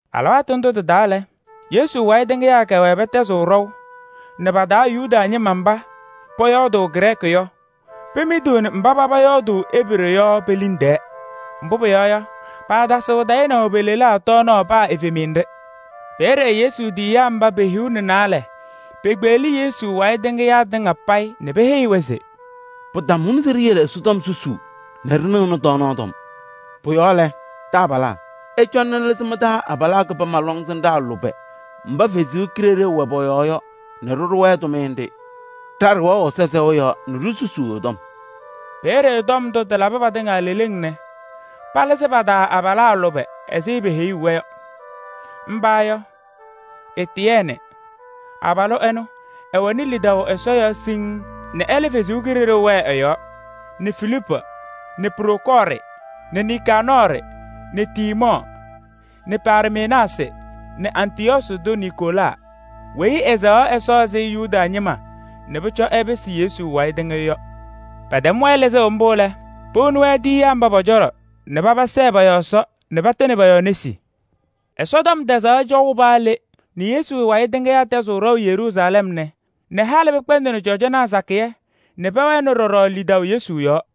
Alɩwaatʋ ndʋ tɩ-taa lɛ, Yesu wayɩ tɩŋɩyaa kɛwɛɛ pɛtɛzɩɣ ɖɔʋ nɛ pa-taa Yuda ñɩma mba pɔyɔɔdʋʋ Grɛɛkɩ yɔ, pemidiɣni mba paba ñɔyɔɔdʋʋ Ebree yɔ pe-liŋ tɛɛ. Mbʋ pʋyɔɔ yɔ, paatasɩɣ tayɩnaʋ pe-lelaa tɔɔnaɣ paa evemiye nɖɩ. Peeye Yesu tiyiyaa mba pe-hiu nɛ naalɛ pekpeɣli Yesu wayɩ tɩŋɩyaa tɩŋa payɩ nɛ peheyi-wɛ se: “Pɩtamʋnɩ se ɖiyele Ɛsɔtɔm susuu nɛ ɖɩnɩɣnɩ tɔɔnaɣ tɔm. Pʋ-yɔɔ lɛ, taabalaa! Ɩcɔna nɛ ɩlɩzɩ mɩ-taa abalaa kɩbama lɔŋsɩnɖaa lʋbɛ mba Ɛsɔ Kalɩzaɣ wɛ pɔ-yɔɔ yɔ nɛ ɖɩɖʋ-wɛ tʋmɩyɛ nɖɩ. Ɖa ɖɛwɛɣ Ɛsɔ sɛʋ yɔɔ nɛ ɖisusuu ɛ-tɔm.” Peeye tɔm ndʋ tɩlabɩ patɩŋa leleŋ nɛ palɩzɩ pa-taa abalaa lʋbɛ ɛzɩ peheyuu-wɛ yɔ. Mba yɔ: Etiyɛɛnɩ, abalʋ ɛnʋ, ɛwɛnɩ lidaʋ Ɛsɔ yɔɔ siŋŋ nɛ ɛlɛ Kalɩzaɣ wɛɛ ɛ-yɔɔ nɛ Filiipu nɛ Prokɔɔrɩ nɛ Nikaanɔɔrɩ nɛ Tiimɔɔ nɛ Parmenaasɩ nɛ Antɩyɔɔsɩ tʋ Niikolaa weyi ɛsɛɣaɣ Ɛsɔ ɛzɩ Yuda ñɩma nɛ pʋcɔ ɛpɩsɩ Yesu wayɩ tɩŋɩyʋ yɔ. Pɛtɛm-wɛ lɩzʋʋ mbʋ lɛ, powoni-wɛ tiyiyaa mba pɔ-cɔlɔ nɛ paba sɛɛ pɔ-yɔɔ Ɛsɔ nɛ patɩnɩ pɔ-yɔɔ nesi. Ɛsɔtɔm tɛzaɣ cɔʋ paa le nɛ Yesu wayɩ tɩŋɩyaa ñɛtɛzɩɣ ɖɔʋ Yeruusalɛm nɛ halɩ pɩkpɛndɩnɩ cɔjɔnaa sakɩyɛ nɛ pɛwɛnɩ ɖɔɖɔ lidaʋ Yesu yɔɔ.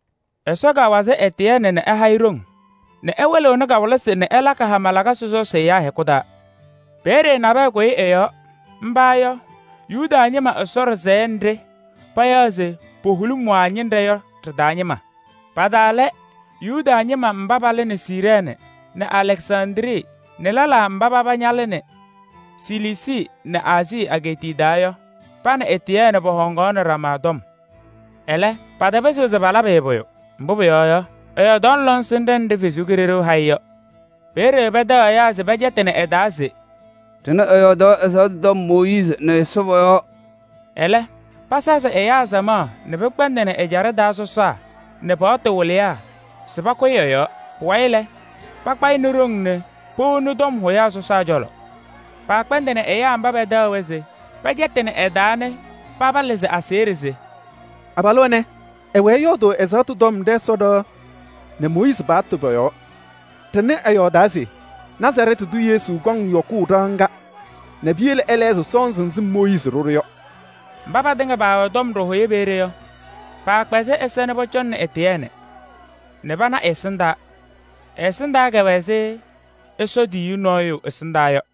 Ɛsɔ kawazɩ Etiyɛɛnɩ yɔɔ nɛ ɛha-ɩ ɖoŋ nɛ ɛwɩlɩɣnɩ kawɩlɩsɩ nɛ ɛlakɩ hama lakasɩ sɔsɔsɩ ɛyaa hɛkʋ taa. Peeye nabɛyɛ kʋyɩ ɛ-yɔɔ. Mba yɔ: Yuda ñɩma Ɛsɔ ɖɩsɛyɛ nɖɩ payaɣ se Puholimwaa ñɩnɖɛ yɔ ɖɩ-taa ñɩma. Pa-taa lɛ: Yuda ñɩma mba palɩnɩ Siirɛɛnɩ nɛ Alɛksandrii nɛ lɛlaa mba paba ñalɩnɩ Siliisii nɛ Aazii egeetiye taa yɔ. Pa nɛ Etiyɛɛnɩ pɔhɔŋaɣnɩnɩ ɖama tɔm. Ɛlɛ, patapɩzɩɣ se palabɩ-ɩ pʋyʋ, mbʋ pʋyɔɔ yɔ, ɛyɔɔdaɣnɩ lɔŋsɩnɖɛ nɖɩ Ɛsɔ Kalɩzaɣ ha-ɩ yɔ. Peeye pɛtɛɣ ɛyaa se pɛcɛtɩnɩ ɛ-taa se: “Ɖɩnɩ ɛyɔɔdaɣ ɛzaɣtʋ tɔm Mooyiizi nɛ Ɛsɔ pɔ-yɔɔ!” Ɛlɛ pasazɩ ɛyaa samaɣ nɛ pɩkpɛndɩnɩ ɛjaɖɛ taa sɔsaa nɛ paɣtʋ wɩlɩyaa se pakʋyɩ ɛ-yɔɔ. Pʋwayɩ lɛ, pakpa-ɩ nɛ ɖoŋ nɛ powoni tɔm hʋyaa sɔsaa cɔlɔ. Paakpɛndɩnɩ ɛyaa mba pɛtɛɣ-wɛ se pɛcɛtɩnɩ ɛ-taa yɔ nɛ paba lɩzɩ aseɣɖe se: “Abalʋ ɛnɛ, ɛwɛɛ ɛyɔɔdʋʋ ɛzaɣtʋ tɔm ɖɛ-Ɛsɔ ɖɩɣa nɛ Mooyiizi paɣtʋ pɔ-yɔɔ! Ɖɩnɩ ɛyɔɔdaa se Nazarɛɛtɩ tʋ Yesu kɔŋ yɔkʋʋ ɖɩɣa ŋga nɛ piyele ɛlɛɣzɩ sɔnzɩ nzɩ Mooyiizi ɖʋ-ɖʋ yɔ.” Mba patɩŋa paawɛ tɔm ɖɩhʋyɛ peeye yɔ, paakpɛzɩ ɛza nɛ pɔcɔŋnɩ Etiyɛɛnɩ, nɛ pana ɛ-ɛsɩndaa, pʋwɛ ɛzɩ Ɛsɔ tiyiyu nɔɔyʋ ɛsɩndaa yɔ.